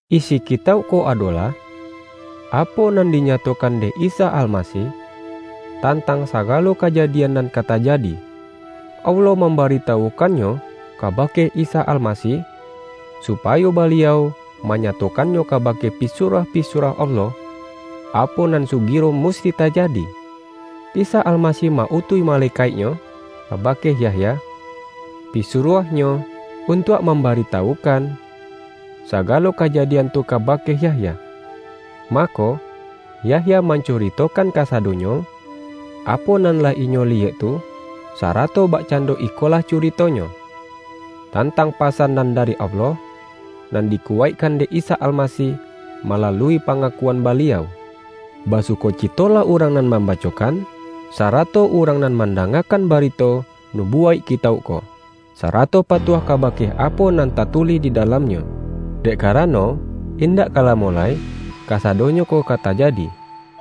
Isi kitauk ko adolah, apo nan dinyatokan dek Isa Almasih, tan-tang sagalo kajadian nan ka tajadi. Allah mambaritawukannyo kabake Isa Almasih, supayo Baliau manya-tokannyo kabake pisuruah-pisuruah Allah, apo nan sugiro musti tajadi. Isa Almasih ma-utuih malekaik-Nyo kaba-ke Yahya, pisuruah-Nyo, untuak mam-baritawukan sagalo kajadian tu kaba-ke Yahya. Mako, Yahya mancuritokan kasadonyo, apo nan lah inyo liyek tu; sarato bakcando ikolah curitonyo, tan-tang pasan nan dari Allah, nan diku-waikkan dek Isa Almasih malalui pa-ngakuan Baliau. Basukocitolah urang nan mambacokan, sarato urang nan mandangakan barito nubuwaik kitauk ko, sarato patuah kabake apo nan tatu-lih di dalamnyo. Dek karano, indak ka lamo lai kasadonyo ko ka tajadi.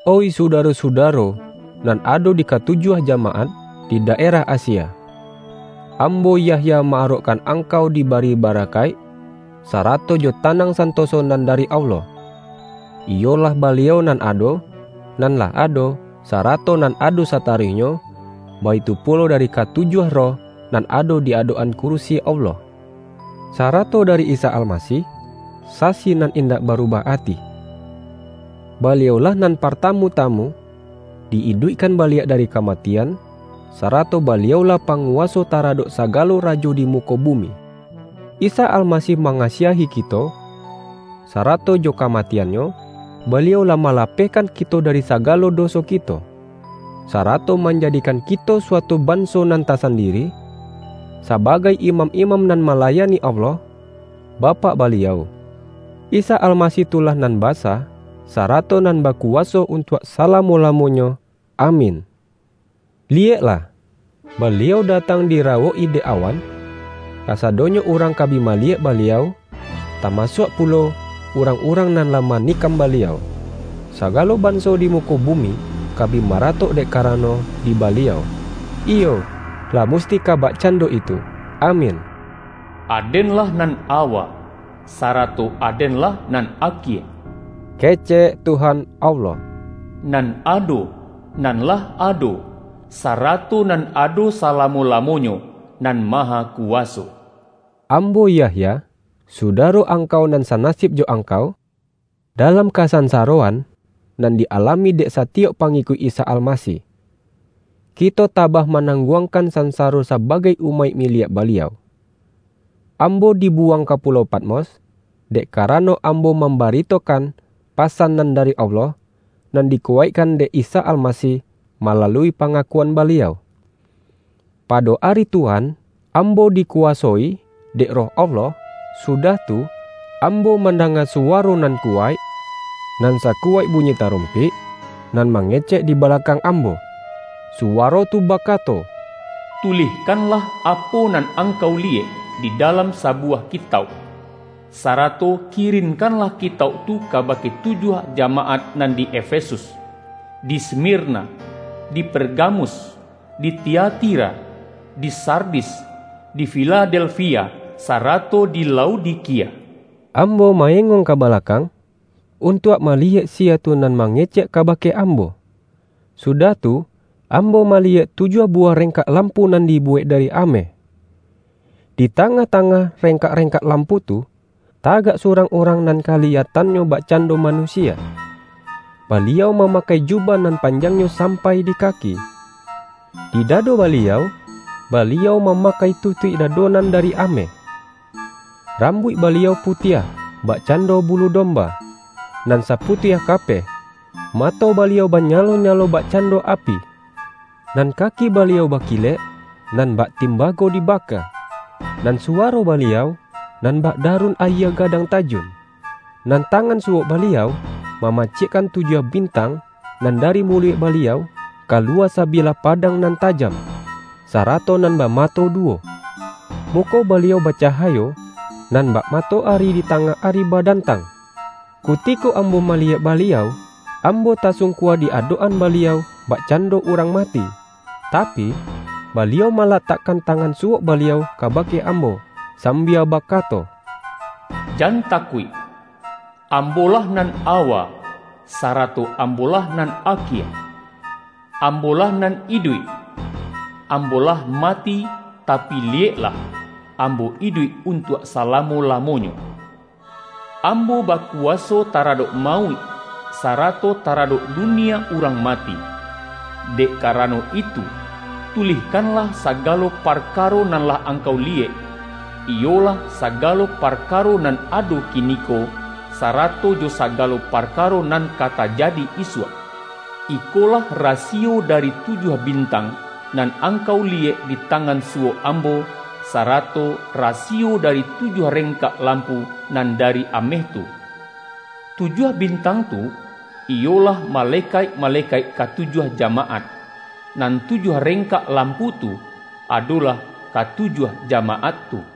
Oih sudaro-sudaro, nan ado di ka-tujuah jamaat, di daerah Asia! Ambo, Yahya, ma-arokkan angkau dibari ba-rakaik, sarato jo tanang santoso nan dari Allah — iyolah Baliau nan ado, nan lah ado, sarato nan ado sataruihnyo — baitu pulo dari katujuah roh, nan ado di adok-an kurisi Allah, sarato dari Isa Almasih, sasi nan indak barubah ati. Baliau-lah nan partamu-tamu di-iduikkan baliak dari kamatian, sarato Baliau-lah panguwaso taradok sagalo rajo di muko bumi. Isa Almasih mangasiahi kito, sara-to jo kamatian-Nyo, Baliau lah malapehkan kito dari sagalo doso kito, sarato manjadikan kito suatu ban-so nan tasandiri, sabagai imam-imam nan malayani Allah, Bapak Baliau. Isa Almasih tu lah nan basa, sarato nan bakuwaso untuak salamo-lamo-nyo. Amin! Liyeklah, Baliau datang dirawok-i dek awan! Kasadonyo urang ka bi ma-liyek Baliau, tamasuak pulo urang-urang nan lah manikam Baliau. Saga-lo banso di muko bumi ka bi maratok dek karano di Baliau. Iyo, lah musti ka bakcando itu! Amin! ”Aden-lah nan awa, sarato Aden-lah nan akie,” kecek Tuhan Allah, nan ado, nan lah ado, sarato nan ado sala-mo-lamonyo, Nan Mahakuwaso. Ambo Yahya, sudaro angkau nan sanasib jo angkau, dalam kasansa-roan nan di-alami dek satiyok pa-ngikuik Isa Almasih. Kito tabah ma-nangguangkan sansaro sabagai umaik miliak Baliau. Ambo dibuwang ka pu-lau Patmos, dek karano ambo mam-baritokan pasan nan dari Allah, nan dikuwaikkan dek Isa Almasih malalui pangakuan Baliau. Pado ari Tuhan, ambo dikuwasoi dek Roh Allah, su-dah tu, ambo mandanga suwaro nan kuwaik nan sakuwaik bunyi tarum-pik nan mangecek di balakang am-bo. Suwaro tu bakato,”Tulihkanlah apo nan angkau liyek, di dalam sabu-wah kitauk, sarato kirinkanlah kitauk tu kabake tujuah jamaat nan di: Efesus, di Smirna, di Pergamus, di Tiati-ra, di Sardis, di Filadelfia, sarato di Laodikia.” Ambo ma-engong ka balakang, untuak maliyek siya tu nan mange-cek kabake ambo. Sudah tu, am-bo maliyek tujuah buwah rengkak lampu nan dibuwek dari ameh. Di tangah-tangah rengkak-reng-kak lampu tu, tagak surang urang nan kaliyatannyo bakcando manu-sia. Baliau mamakai jubah nan pan-jangnyo sampai di kaki. Di dado Baliau, Baliau mamakai tutuik da-do nan dari ameh. Rambuik Ba-liau putiah bakcando bulu domba, nan saputiah kapeh. Mato Baliau banyalo-nyalo bakcando api; nan kaki Baliau bakilek, nan bak tim-bago dibaka. Nan suwaro Baliau, nan bak darun ayie gadang tajun. Nan tangan suwok Baliau, ma-macikkan tujuah bintang, nan dari muluik Baliau, kaluwa sabilah pa-dang nan tajam, sarato nan bamato duwo. Muko Baliau bacahayo, nan bak matoari di tangah ari badan-tang. Kutiko ambo maliyek Ba-liau, ambo tasungkua di adok-an Baliau bakcando urang mati. Ta-pi, Baliau malatakkan tangan suwok Baliau kabake ambo, sambia baka-to,”Jan takuik! Ambo-lah nan awa, sarato Ambo-lah nan akie. Am-bo-lah Nan Iduik! Ambo lah mati, tapi liyeklah, Ambo iduik untuak salamo-lamonyo. Ambo bakuwaso taradok mauik, sarato taradok du-nia urang mati. Dek karano itu, tulihkanlah sagalo parkaro nan lah angkau liyek, iyolah, sagalo parka-ro nan ado kiniko, sarato jo sagalo parkaro nan ka tajadi isuak. Iko-lah rasiyo dari tujuah bintang, nan angkau liyek di tangan suwok Am-bo, sarato rasiyo dari tujuah reng-kak lampu nan dari ameh tu: Tujuah bintang tu, iyolah, malekaik-male-kaik katujuah jamaat, nan tujuah rengkak lampu tu, adolah katujuah jamaat tu.”